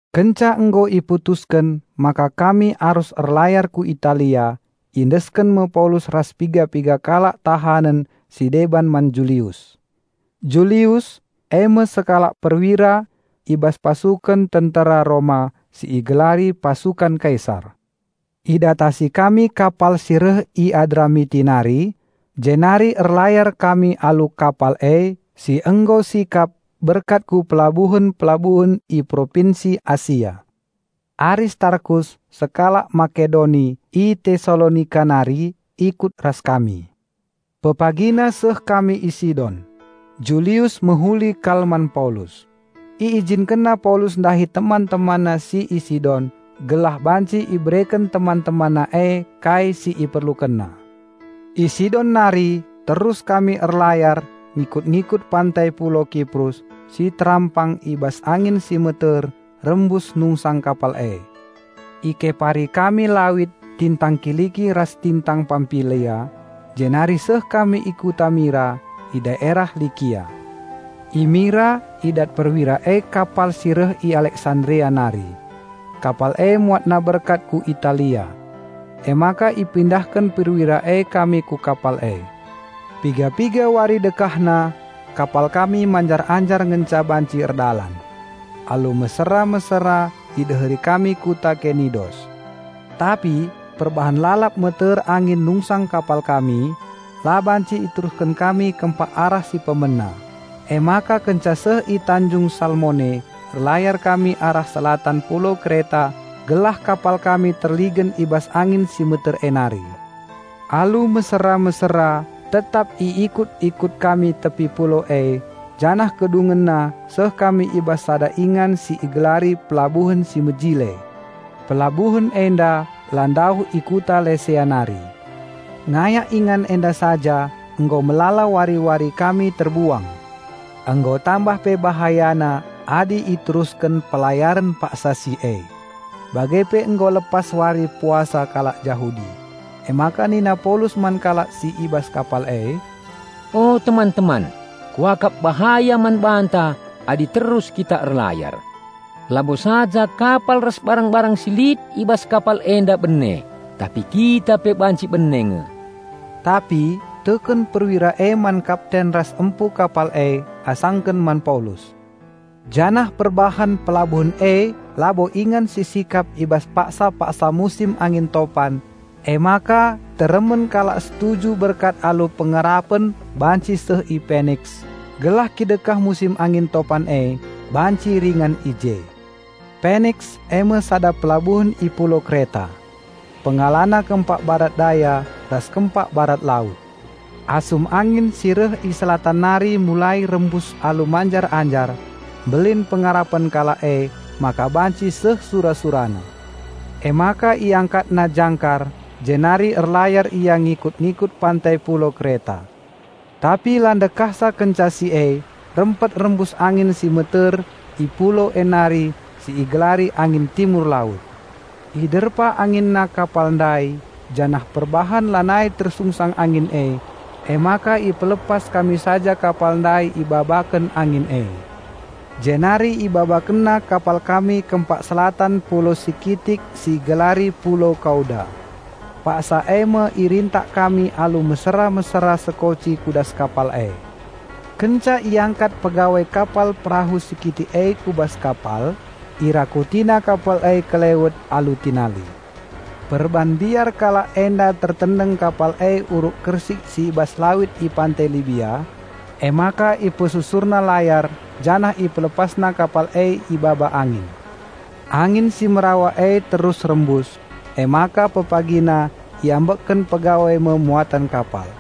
Kenca nggo iputusken maka kami arus erlayar ku Italia, iendesken me Paulus ras piga-piga kalak tahanen si deban man Julius. Julius, eme sekalak perwira i bas pasuken tentera Roma si igelari "Pasukan Kaisar". Idatasi kami kapal si reh i Adramiti nari, jenari erlayar kami alu kapal e si nggo sikap berkat ku pelabuhen-pelabuhen i Propinsi Asia. Aristarkus, sekalak Makedoni i Tesalonika nari ikut ras kami. Pepagina seh kami i Sidon. Julius mehuli kal man Paulus. Iijinkenna Paulus ndahi teman-temanna si i Sidon gelah banci ibereken teman-temanna e kai si iperlukenna. I Sidon nari terus kami erlayar ngikut-ngikut pantai pulau Kiprus si terampang i bas angin si meter rembus nungsang kapal e. Ikepari kami lawit tingtang Kiliki ras tingtang Pampilia, jenari seh kami i kuta Mira, i daerah Likia. I Mira idat perwira e kapal si reh i Aleksandria nari. Kapal e muatna berkat ku Italia. Emaka ipindahken perwira e kami ku kapal e. Piga-piga wari dekahna kapal kami manjar-anjar ngenca banci erdalan. Alu mesera-mesera ideheri kami kuta Kenidos. Tapi perbahan lalap meter angin nungsang kapal kami, la banci iterusken kami kempak arah si pemena; emaka kenca seh i tanjung Salmone erlayar kami arah Selatan pulau Kreta gelah kapal kami terligen i bas angin si meter e nari. Alu mesera-mesera tetap iikut-ikut kami tepi pulau e janah kedungenna seh kami i bas sada ingan si igelari Pelabuhen si Mejile. Pelabuhen enda la ndauh i kuta Lesea nari. Ngayak ingan enda saja nggo melala wari-wari kami terbuang. Nggo tambah pe bahayana adi iterusken pelayaren paksa si e. Bage pe nggo lepas wari puasa kalak Jahudi. Emaka nina Paulus man kalak si i bas kapal e, "O teman-teman, kuakap bahaya man banta adi terus kita erlayar. Labo saja kapal ras barang-barang si lit i bas kapal enda bene tapi kita pe banci bene nge." Tapi teken perwira e man kapten ras empu kapal e asangken man Paulus. Janah perbahan pelabuhen e labo ingan si sikap i bas paksa-paksa musim angin topan emaka teremen kalak setuju berkat alu pengarapen banci seh i Peniks, gelah kidekah musim angin topan e banci ringan i je. Peniks, eme sada pelabuhen i pulau Kreta. Pengalana kempak Barat Daya ras kempak Barat Laut. Asum angin si reh i Selatan nari mulai rembus alu manjar-anjar, mbelin pengarapen kalak emaka banci seh sura-surana. Emaka iangkatna jangkar jenari erlayar ia ngikut-ngikut pantai pulau Kreta. Tapi la ndekahsa kenca si e, rempet rembus angin si meter i pulau e nari si igelari angin Timur Laut. Iderpa anginna kapal ndai janah perbahan lanai tersungsang angin e, emaka ipelepas kami saja kapal ndai ibabaken angin e. Jenari ibabakenna kapal kami kempak Selatan pulau si kitik si igelari pulau Kauda. Paksa eme irintak kami alu mesera-mesera sekoci ku das kapal e. Kenca iangkat pegawai kapal perahu si kitik e ku bas kapal, irakutina kapal e kelewet alu tinali. Perban mbiar kalak enda tertendeng kapal e uruk kersik si i bas lawit i pantai Libia, emaka ipesusurna layar janah ipelepasna kapal e ibaba angin. Angin si merawa e terus rembus, emaka pepagina iambekken pegawai me muaten kapal.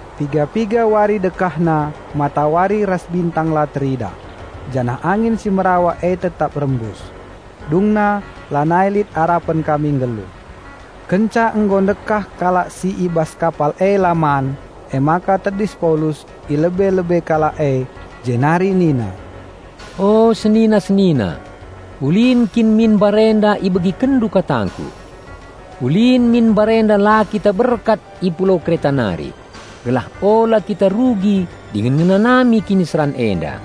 Piga-piga wari dekahna matawari ras bintang la teridah, janah angin si merawa e tetap rembus. Dungna lanai lit arapen kami nggeluh. Kenca nggo ndekah kalak si i bas kapal e la man, emaka tedis Paulus i lebe-lebe kalak e jenari nina, "O senina-senina, ulin kin min mbarenda ibegikenndu katangku. Ulin min mbarenda la kita berkat i pulau Kreta nari, gelah ula kita rugi dingen ngenanami kiniseran enda.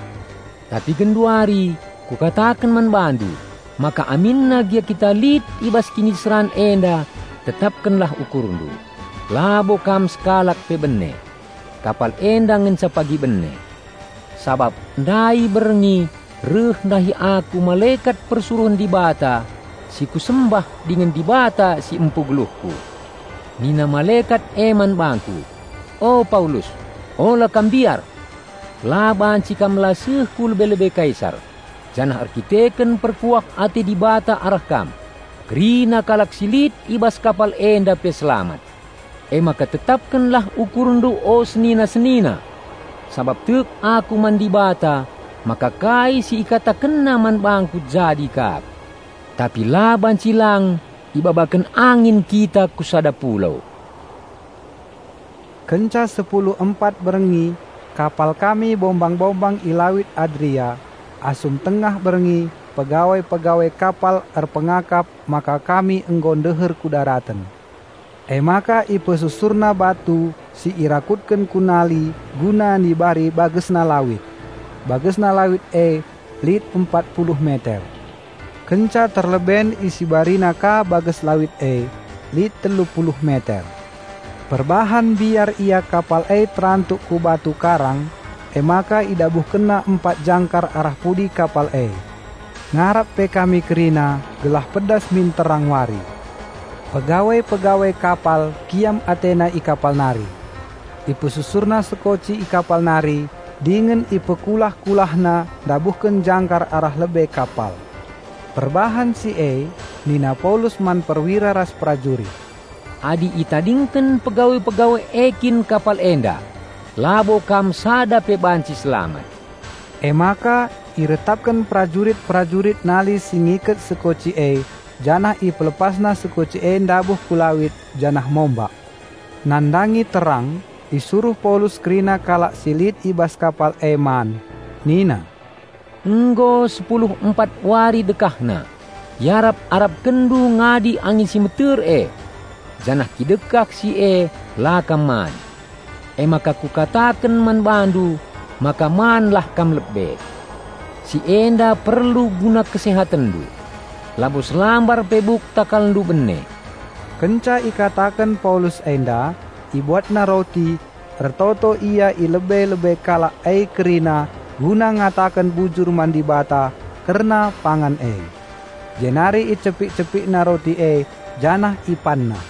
Tapi genduari, kukataken man bandu maka aminna gia kita lit i bas kiniseran enda tetapkenlah ukurndu, labo kam sekalak pe bene. Kapal enda ngenca pagi bene. Sabap ndai berngi reh ndahi aku malekat persuruhen Dibata si kusembah dingen Dibata si empu geluhku. Nina malekat e man bangku, 'O Paulus, ula kam mbiar! La banci kam la seh ku lebe-lebe Kaisar, janah erdandanken perkuah ate Dibata arah kam, kerina kalak si lit i bas kapal enda pe selamat.' Emaka tetapkenlah ukurndu o senina-senina! Sabap tek aku man Dibata maka kai si IkatakenNa man bangku jadi kap. Tapi la banci lang ibabaken angin kita ku sada pulau." Kenca sepulu empat berngi kapal kami bombang-bombang i Lawit Adria, asum tengah berngi pegawai-pegawai kapal erpengakap maka kami nggo ndeher ku daraten. Emaka ipesusurna batu si irakutken ku nali guna nibari bagesna lawit. Bagesna lawit e lit empat puluh meter. Kenca terleben isibarina ka bages lawit e, lit telu puluh meter. Perbahan mbiar ia kapal e terantuk ku batu karang emaka idabuhkenna empat jangkar arah pudi kapal e. Ngarap pe kami kerina gelah pedas min terang wari. Pegawai-pegawai kapal kiam atena i kapal nari. Ipesusurna sekoci i kapal nari, dingen ipekulah-kulahna ndabuhken jangkar arah lebe kapal. Perbahan si e nina Paulus man perwira ras prajurit, "Adi itadingken pegawai-pegawai e kin kapal enda labo kam sada pe banci selamat." Emaka iretapken perajurit-perajurit nali si ngiket sekoci e janah ipelepasna sekoci e ndabuh ku lawit janah mombak. Nandangi terang, isuruh Paulus kerina kalak si lit i bas kapal e man. Nina, "Nggo sepulu empat wari dekahna iarap-arapkenndu ngadi angin si meter e. Janah kidekah si e la kam man. Emaka kukataken man bandu maka man lah kam lebe. Si enda perlu guna kesehatenndu. Labo selambar pe buk takalndu bene." Kenca ikataken Paulus enda, ibuatna roti, ertoto ia i lebe-lebe kalak e kerina guna ngataken bujur man Dibata kerna pangan e. Jenari icepik-cepikna roti e janah ipanna.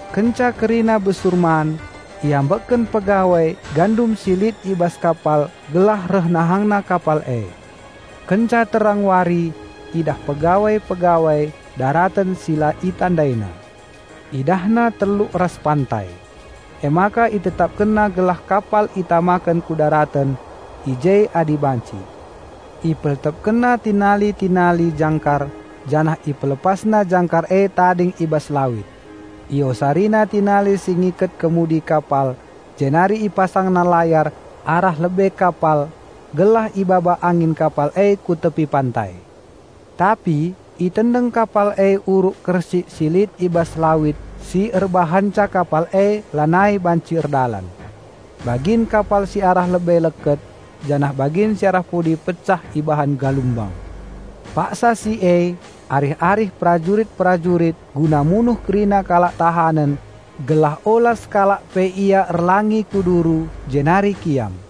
Kenca kerina besur man, iambekken pegawai gandum si lit i bas kapal gelah reh nahangna kapal e. Kenca terang wari idah pegawai-pegawai daraten si la itandaina. Idahna teluk ras pantai. Emaka itetapkenna gelah kapal itamaken ku daraten i je adi banci. Ipeltepkenna tinali-tinali jangkar janah ipelepasna jangkar e tading i bas lawit. Iosarina tinali si ngiket kemudi kapal jenari ipasangna layar arah lebe kapal gelah ibaba angin kapal e ku tepi pantai. Tapi itendeng kapal e uruk kersik si lit i bas lawit si erbahanca kapal e lanai banci erdalan. Bagin kapal si arah lebe leket janah bagin si arah pudi pecah ibahan galumbang. Paksa si e arih-arih perajurit-perajurit guna munuh kerina kalak tahanen gelah ula sekalak pe ia erlangi ku duru jenari kiam.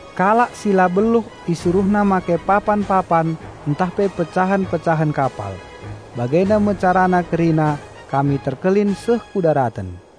Kalak si la beluh isuruhna make papan-papan ntah pe pecahen-pecahen kapal. Bagenda me carana kerina kami terkelin seh ku daraten.